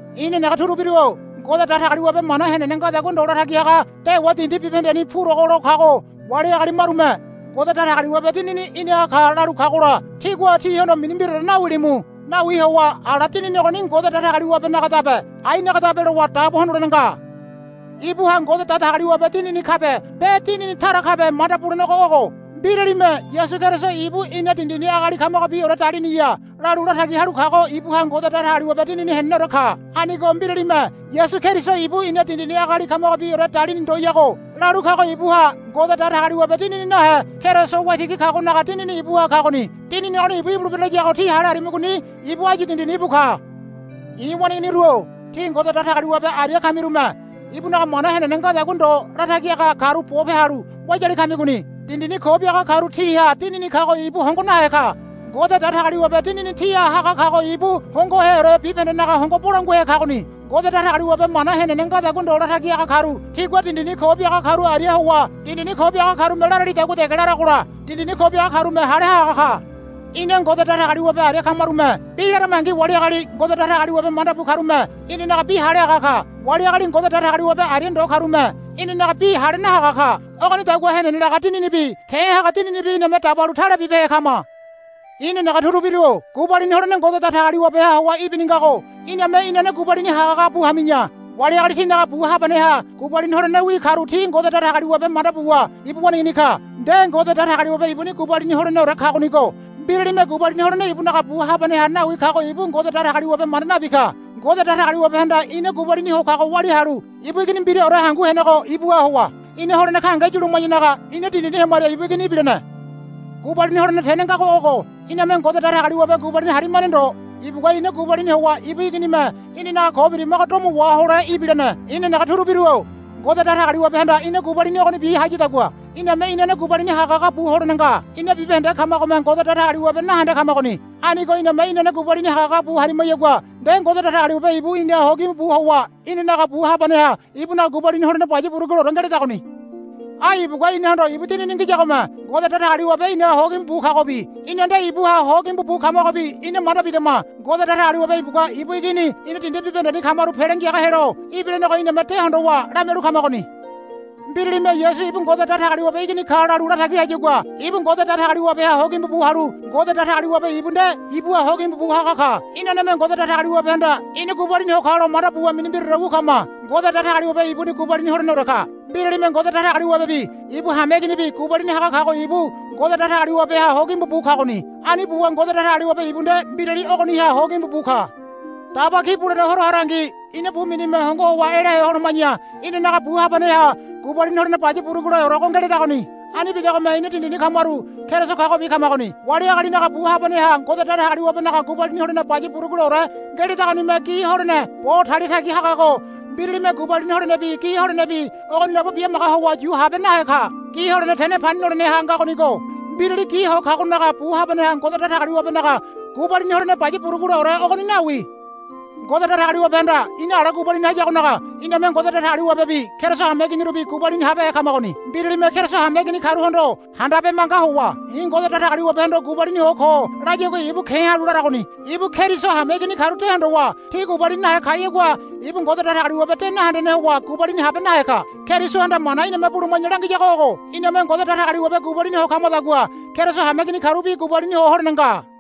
I̱ nenege turubiru-o Ngode Datagaliwabe mana henene ngadagua ndo latagi haga dewa dindi bibahendeni purogo lo kago wali agali marume, Ngode Datagaliwabe Dinini i̱naha ka, lalu kagola tígua tihondo mini mbiraore nawilimu. Nawi howa ala dinini ogoni Ngode Datagaliwabenagadabe ainagadabe lowa dabo hondolene nga. Ibuha Ngode Datagaliwabe Dinini kabe be dinini tara kabe manda bulenego ogo. Mbiralime, Yasu Keriso ibu ina dindini agali kamagobiore daliniya, lalu latagi halu kago ibuha Ngode Datagaliwabe Dinini heneneore ka. Anigo mbiralime, Yasu Keriso ibu ina dindini agali kamagobiore dalini ndoyago, lalu kago ibuha Ngode Datagaliwabe Dinini nahe Keriso Waitigi kagonaga dinini ibuha kagoni. Dinini ogoni ibu ibulebira layago tí hale harimigoni ibu áyu dindini íbu ka. I̱ waneiginiru-o tí Ngode Datagaliwabe aria kamirume ibunaga mana henene ngadagua ndo latagi haga karu bope halu wayali kamigoni. Dindini ko biaga karu tiha dinini kago ibu hongo nahe ka. Ngode Datagaliwabe Dinini tíha haga kago ibu hongoheore bibahendenaga hongo bolanguahe kagoni. Ngode Datagaliwabe mana henene ngadagua ndo latagi haga karu tigua dindini ko biaga karu aria howa dindini ko biaga karume laralidagua dege laragola dindini ko biaga karume hale haga ka. Ina Ngode Datagaliwabe aria kamarume bi laramangi wali agali Ngode Datagaliwabe manda bu karume inanaga bi hale haga ka. Wali agali Ngode Datagaliwabe aria ndo karume inanaga bi hale nahaga ka. Ogonidagua henene laga Dininibi ke̱ haga dininibi iname dabalu tale bibehe kama. I̱ nenege turubiru-o gubalini holene Ngode Datagaliwabeha howa ibini ngago iname inane gubalini hagahaga bu hami̱ya. Wali agali tinaga bu habaneha gubalini holenewi karu ti Ngode Datagaliwabe manda buwa ibu waneigini ka. Nde Ngode Datagaliwabe ibuni gubalini holeneore kagonigo mbiralime gubalini holene ibunaga bu habaneha nawi kago ibu Ngode Datagaliwabe manda nabi ka. Ngode Datagaliwabehanda ina gubalini ho kago walia halu ibu Igini mbiraore hangu henego ibuha howa ina holene gahenge yuluma̱yanaga ina dindini hemaria ibu Igini ibilene. Gubalini holene tene ngago ogo, Iname Ngode Datagaliwabe gubalini harimane ndo. Ibugua ina gubalini howa ibu Iginime inanaga ko birimago domo wahole ibilene. I̱ nenege turubiru-o Ngode Datagaliwabehanda ina gubalini ogonibi hayadagua iname inane gubalini hagahaga bu holene nga. Ina bibahende kamagome Ngode Datagaliwabe nahende kamagoni. Anigo iname inane gubalini hagahaga bu harimayagua nde Ngode Datagaliwabe ibu inaha hogimbu bu howa inanaga bu habaneha ibunaga gubalini holene baya buruguleore ngeledagoni. Ai ibugua inahondo ibu Dinini ngiyagome Ngode Datagaliwabe inaha hogimbu bu kagobi ina nde ibuha hogimbu bu kamagobi ina manda bidama. Ngode Datagaliwabe ibugua ibu Igini ina dindi bibahendeni kamaru Pele Ngiaga helo ibilenego iname de hondowa lamialu kamagoni. Mbiralime, Yasu ibu Ngode Datagaliwabe Igini ka, lalu latagi hayagua ibu Ngode Datagaliwabeha hogimbu bu halu Ngode Datagaliwabe ibu nde ibuha hogimbu bu haga ka. Inaneme Ngode Datagaliwabehanda ina gubalini ho kalo manda buwa mini mbiraore wu kama. Ngode Datagaliwabe ibuni gubalini holeneore ka. Mbiralime Ngode Datagaliwabebi ibu hameiginibi gubalini haga kago ibu Ngode Datagaliwabeha hogimbu bu kagoni. Ani buwa Ngode Datagaliwabe ibu nde mbirali ogoniha hogimbu bu ka. Daba Ki Bulene Horo harangi ina bu minime hongo howa elahe holoma̱ya inanaga bu habaneha gubalini holene baya buruguleorego ngeledagoni. Ani bidagome ina dindini kamaru Keriso kagobi kamagoni. Wali agalinaga bu habaneha Ngode Datagaliwabenaga gubalini holene baya buruguleore ngeledagonime gi holene bo talia tagi hagago mbiralime gubalini holenebi gi holenebi ogoni labo bimaga howa yu habe nahe ka. Gi holene tene pani noleneha ngagonigo mbirali gi ho kagonaga bu habaneha Ngode Datagaliwabenaga gubalini holene baya buruguleore ogoni nawi. Ngode Datagaliwabehanda ina ala gubalini hayagonaga iname Ngode Datagaliwabebi Keriso hameiginirubi gubalini habehe kamagoni. Mbiralime Keriso hameigini karuhondo handabe manga howa, I̱ Ngode Datagaliwabehondo gubalini ho ko, layagua ibu ke̱ halu laragoni. Ibu Keriso hameigini karu de hondowa ti gubalini nahe kayagua ibu Ngode Datagaliwabe de nahendene howa gubalini habe nahe ka. Kerisohanda mana iname buluma̱ya langiyago ogo. Iname Ngode Datagaliwabe gubalini ho kamadagua Keriso hameigini karubi gubalini ho holene nga.